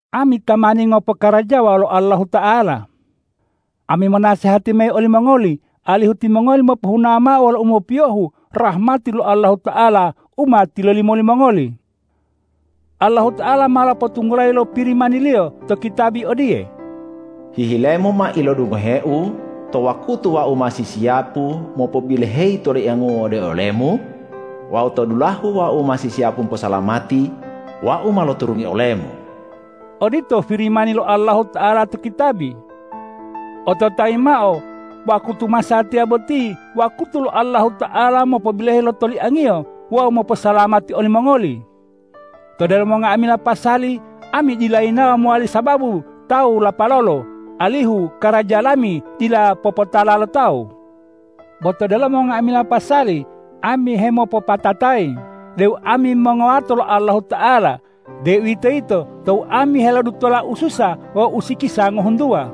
Ami tamani ngopokarajawa wolo Allahuta'ala. Ami monasehati mayi olimongoli alihu timongoli mopohuna mao wolo umopiyohu rahmati lo Allahuta'ala u ma tilolimo limongoli. Allahuta'ala ma lopotunggulayi lo Pirimani-Liyo to kitabi odiye,”Hihilemu ma ilodungohe-U to wakutu Wau ma sisiyapu mopobiloheyi lo toliangu-U ode olemu, wawu to dulahe Wau ma sisiyapu moposalamati, Wau ma loturungi olemu.” Odito Pirimani lo Allahuta'ala to kitabi. Ototayi mao: Wakutu masatiya boti wakutu lo Allahuta'ala mopobiloheyi lo toliang-Iyo wawu moposalamati olimongoli. To delomo nga'amila pasali ami dila yinawo mowali sababu tawu lapalolo, alihu karaja lami dila popotala lo tawu. Bo to delomo nga'amila pasali ami hemopopatatayi deu ami mongowato lo Allahuta'ala, deuwitoyito tou ami helodutola ususa wawu usikisa ngohuntuwa,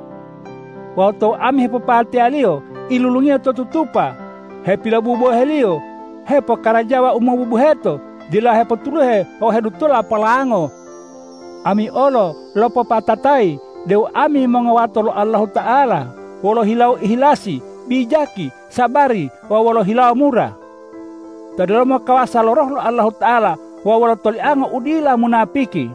wawu tou ami hepopateyaliyo, ilulungiyo to tutupa, hepilobuboheliyo, hepokarajawa u mobubuheto, dila hepotuluhe wawu hedutola polango. Ami olo lopopatatayi deu ami mongowato lo Allahuta'ala wolo hilawo ihilasi, bijaki, sabari wawu wolo hilawo mura. To delomo kawasa lo Roh lo Allahuta'ala wawu wolo tolianga u dila munapiki;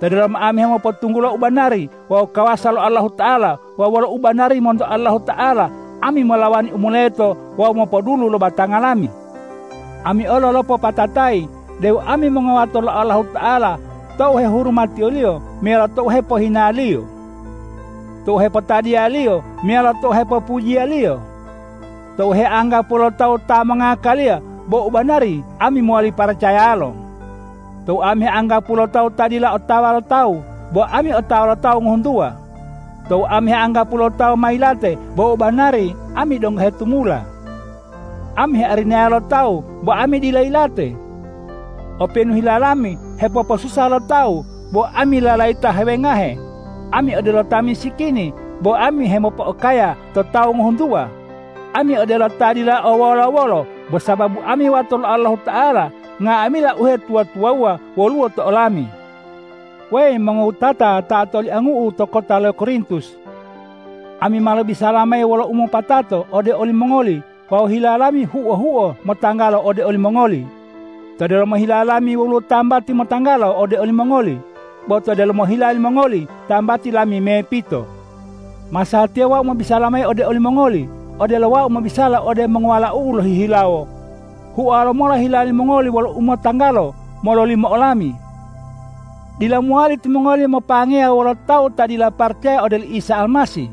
to delomo ami hemopotunggulo ubanari wawu kawasa lo Allahuta'ala; wawu wolo u banari monto Allahuta'ala, ami molawani u moleto wawu mopodulu lo batanga lami. Ami olo lopopatatayi deu ami mongowato lo Allahuta'ala tou hehurumatiyoliyo meyalo tou hepohinaliyo; tou hepotadiyaliyo meyalo tou hepopujiyaliyo; tou heanggapuwo lo tawu ta mongngakaliya, bo u banari ami mowali paracayalo; tou ami heanggapuwo lo tawu ta dila otawa lo tawu, bo ami otawa lo tawu ngohuntuwa; tou ami heanggapuwo lo tawu ma yilate, bo u banari ami donggo hetumula. Ami hearinaya lo tawu, bo ami dila yilate. Openu hila lami hepoposusa lo tawu, bo ami lalayita hewengahe; ami odelo ta misikini, bo ami hemopo'okaya to tawu ngohuntuwa; ami odelo ta dila o wolo-wolo, bo sababu ami wato lo Allahuta'ala nga'amila uhetuwa-tuwawuwa woluwo to olami. Weyi mongowutata ta otoliangu'u to kota lo Korintus! Ami ma lobisala mayi wolo umopatato ode olimongoli wawu hila lami huo-huo motanggalo ode olimongoli. To delomo hila lami woluwo tambati motanggalo ode olimongoli. Bo to delomo hila limongoli tambati lami mepito. Masatiya wau mobisala mayi ode olimongoli odelo wau mobisala ode mongowalau'u lohihilawo: Huowa lomola hila limongoli wolo umotanggalo mololimo olami! Dila mowali timongoli mopangeya wolo tawu ta dila paracaya ode oli Isa Almasih.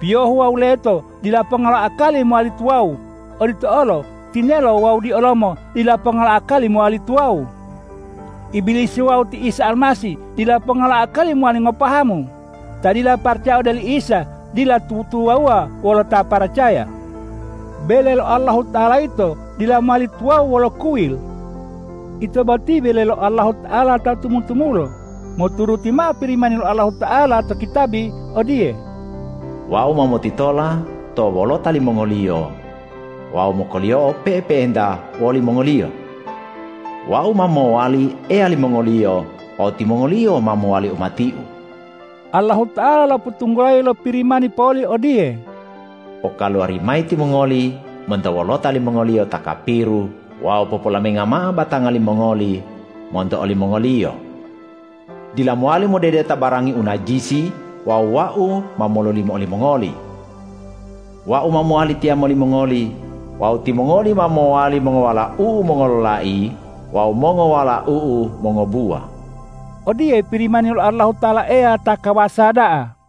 Piyohu wawu leto dila ponga lo akali mowali tuwawu. Odito olo tinelo wawu diolomo dila ponga lo akali mowali tuwawu. Ibilisi wawu ti Isa Almasih dila ponga lo akali mowali ngopahamu. Ta dila paracaya ode oli Isa dila tutuwawuwa wolo ta paracaya. Bele lo Allahuta'ala yito dila mowali tuwawu wolo kuyil. Ito boti bele lo Allahuta'ala ta tumu-tumulo moturuti mao Pirimani lo Allahuta'ala to kitabi odiye,”Wau ma motitola to wolota limongoliyo wawu mokoliyoa pe'epe'enta wolimongoliyo. Wau ma mowali Eya limongoliyo wawu timongoliyo ma mowali umati-U.” Allahuta'ala lopotunggulayi lo Pirimani poli odiye,”Pokaluwari mayi timongoli monto wolota limongoliyo ta kapiru wawu popolaminga mao batanga limongoli monto olimongoliyo. Dila mowali modedeta barangi u najisi wawu Wau ma mololimo olimongoli. Wau ma mowali tiyamo limongoli wawu timongoli ma mowali mongowalau-U mongololai wawu mongowalau-U mongobuwa.” Odiye Pirimani lo Allahuta'ala Eya ta kawasa da'a.